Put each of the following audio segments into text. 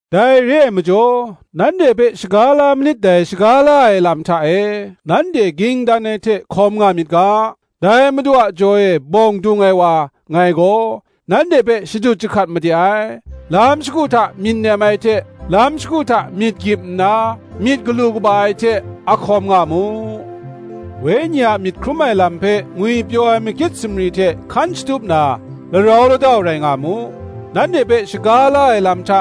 Dai re ai majaw, nanhte hpe shaga la manit dai shaga la ai lam hta e, nanhte ging dan ai hte hkawm nga myit ga, dai Madu a jaw e bawng dung ai wa, ngai gaw, nanhte hpe shadut jahkat made ai. Lam shagu hta myit nem ai hte lam shagu hta myit gyip nna, myit galu kaba ai hte, a hkawm nga mu: Wenyi a myit hkrum ai lam hpe ngwipyaw ai makyit sumri hte hkan shatup na, larau ladau rai nga mu. Nanhte hpe shaga la ai lam hta,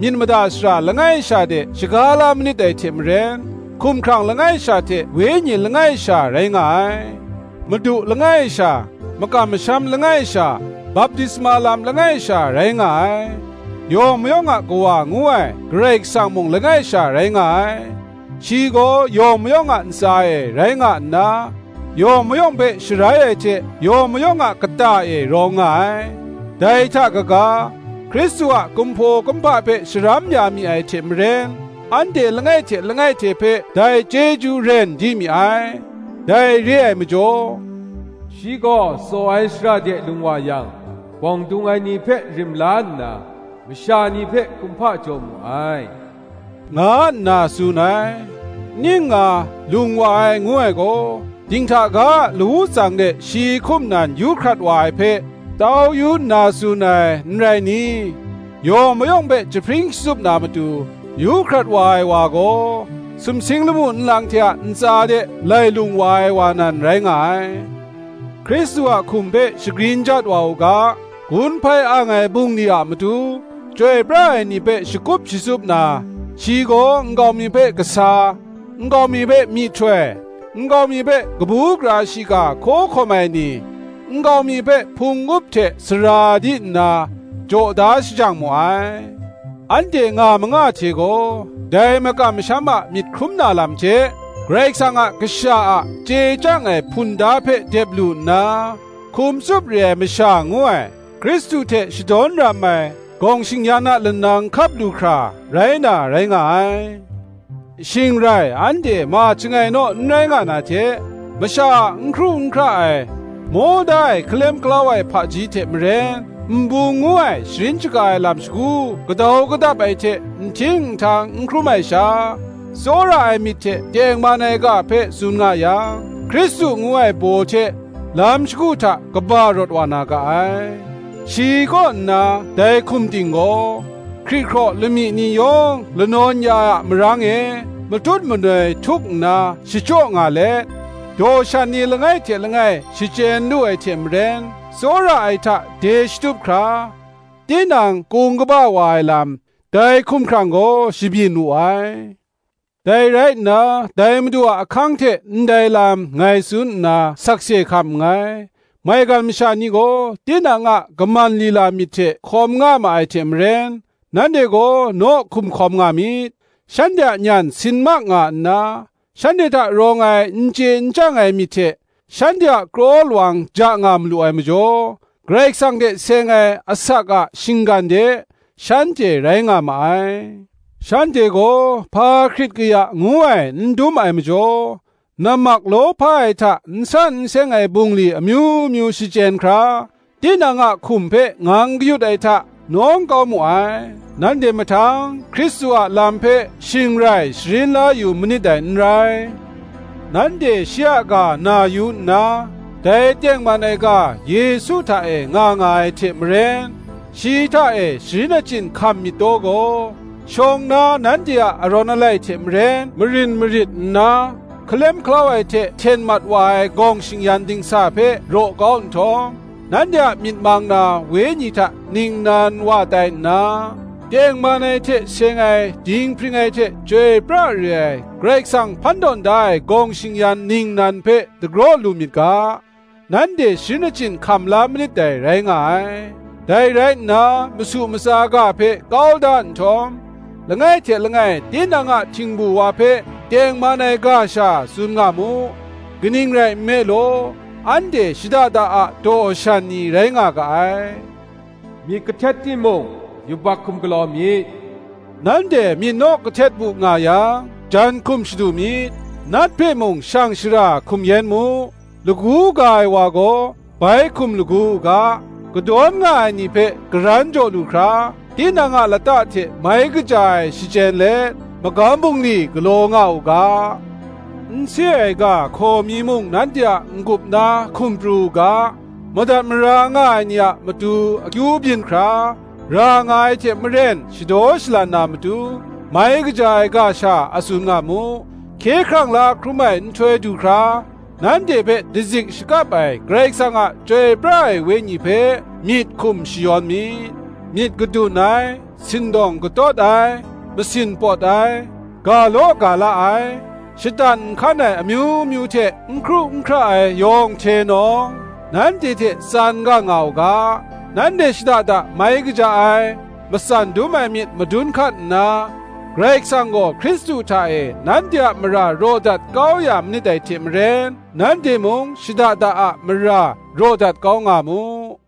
myit mada shara langai sha de, shaga la manit dai hte maren, hkumhkrang langai sha hte Wenyi langai sha rai nga ai: Madu langai sha, makam masham langai sha, baptisma lam langai sha rai nga ai: yawng mayawng a Kawa ngu ai Karai Kasang mung langai sha rai nga ai: shi gaw yawng mayawng a ntsa e rai nga nna, yawng mayawng hpe sharai ai hte, yawng mayawng a kata e rawng nga ai. Dai hta kaga, Hkristu a kumhpaw kumhpa hpe sharam ya mi ai hte maren, anhte langai hte langai hte hpe dai chyeju ren di mi ai. Dai re ai majaw, Shi gaw tsaw ai shara de lung wa yang, Bawng dung ai ni hpe rim la nna, Masha ni hpe kumhpa jaw mu ai, nga nna tsun ai. Ning nga, lung wa ai ngu ai gaw, dinghta ga a lawu tsang de shi hkum nan yu hkrat wa ai hpe, tau yu nna, tsun ai, n rai ni? Yawng mayawng hpe jahpring shatsup na matu, yu hkrat wa ai wa gaw, sumsing lamu nlang hte a ntsa de lai lung wa ai wa nan, rai nga ai. Hkristu a hkum hpe shagrin jat wa u ga, gun hpai ang ai bungli a matu, chyoi pra ai ni hpe shakup shatsup na, shi gaw nkau mi hpe kasa, nkau mi hpe myihtoi, nkau mi hpe kabu gara shiga hkaw hkawm ai ni, nkau mi hpe hpung up hte sara di nna, jaw da shajang mu ai. anhte nga manga hte gaw, dai makam masham a myit hkrum na lam hte, Karai Kasang a Kasha a chye chyang ai hpunda hpe dep lu nna, hkum tsup re ai masha ngu ai, Hkristu hte shadawn ram ai gawng shing-yan a lanang hkap lu hkra, rai na rai nga ai: shing rai anhte ma chyangai naw n rai nga na hte, masha a n hkru n hkra ai, maw da ai hkalem hkalau ai hpaji hte maren, nbung ngu ai sharin shaga ai lam shagu gadau gadap ai hte nhting nhtang n hkrum ai sha, tsawra ai myit hte tengman ai ga hpe tsun nga yang, Hkristu ngu ai baw hte lam shagu hta kaba rawt wa na ga ai: shi kaw nna, dai hkum ting gaw, hkrihkraw lamyi ni yawng lanawn ya ai a marang e, matut manoi htuk nna shachyaw nga let, daw shan ni langai hte langai shachyen lu ai hte maren, tsawra ai hta de shatup hkra, tinang kung kaba wa ai lam, dai hkumhkrang gaw shabyin wu ai. Dai rai nna, dai Madu a ahkang hte ndai lam ngai tsun nna sakse hkam nngai: maigan masha ni gaw tinang a kaman lila myit hte hkawm nga ma ai hte maren, nanhte gaw naw hkum hkawm nga myit: shanhte a nyan sin mak nga nna, shanhte hta rawng ai n chye n chyang ai myit hte, shanhte a kraw lawang ja nga malu ai majaw, Karai Kasang hte seng ai asak a shinggan de, shanhte rai nga ma ai: shanhte gaw hpa hkrit kaya ngu ai n dum ai majaw, nammak lawhpa ai hta n san n seng ai bungli amyu myu shachyen hkra, tinang a hkum hpe ngang kayut ai hta, nawng kau mu ai. Nanhte mahtang Hkristu a lam hpe shing rai sharin la yu manit dai n rai: nanhte shi a ga na yu nna, dai tengman ai ga Yesu hta e nga nga ai hte maren, shi hta e sharin achyin hkam myit taw gaw, shawng na nanhte a arawn alai hte maren, marin marit nna hkalem hkalau ai hte hten mat wa ai gawng shing-yan dingsa hpe raw kau nhtawm; nanhte a myit mang na wenyi hta ningnan wa tai nna, tengman ai hte seng ai dinghpring ai hte chyoi pra re ai Karai Kasang hpan tawn da ai gawng shing-yan ningnan hpe dagraw lu myit ga, nanhte sharin achyin hkam la manit dai, rai nga ai. Dai rai nna, masu matsa ga hpe kau da nhtawm, langai hte langai tinang a htingbu wa hpe tengman ai ga sha tsun nga mu: kaning rai nme law, anhte shada da a daw shan ni rai nga ga ai. “Myit kahtet timung, yubak hkum galaw myit:” nanhte myit naw kahtet bu nga yang, jan hkum shadu myit: nat hpe mung shang shara hkum yen mu. Lagu ga ai wa gaw, bai hkum lagu u ga; kadawn nga ai ni hpe karan jaw lu hkra, tinang a lata hte mai kaja ai shachyen let, magam bungli galaw nga u ga. N se ai ga hkaw mi mung nanhte a n-gup na hkum pru u ga; madat mara nga ai ni a matu akyu byin hkra, ra nga ai hte maren shadaw shalan na matu, mai kaja ai ga sha a tsun na mu. Hkye hkrang la hkrum ai nhtoi du hkra, nanhte hpe dazik shakap ai Karai Kasang a Chyoi pra ai Wenyi hpe, myit hkum shayawn myit. Myit gadun ai, sindawng katawt ai, masin pawt ai, ga law ga la ai, shatan nhkan ai amyu myu hte, n hkru n hkra ai yawng hte nawng, nanhte hte tsan gang nga u ga. Nanhte shada da mai kaja ai, matsan dum ai myit madun hkat nna, Karai Kasang gaw Hkristu hta e nanhte a mara raw dat kau ya manit dai hte maren, nanhte mung shada da a mara raw dat kau nga mu.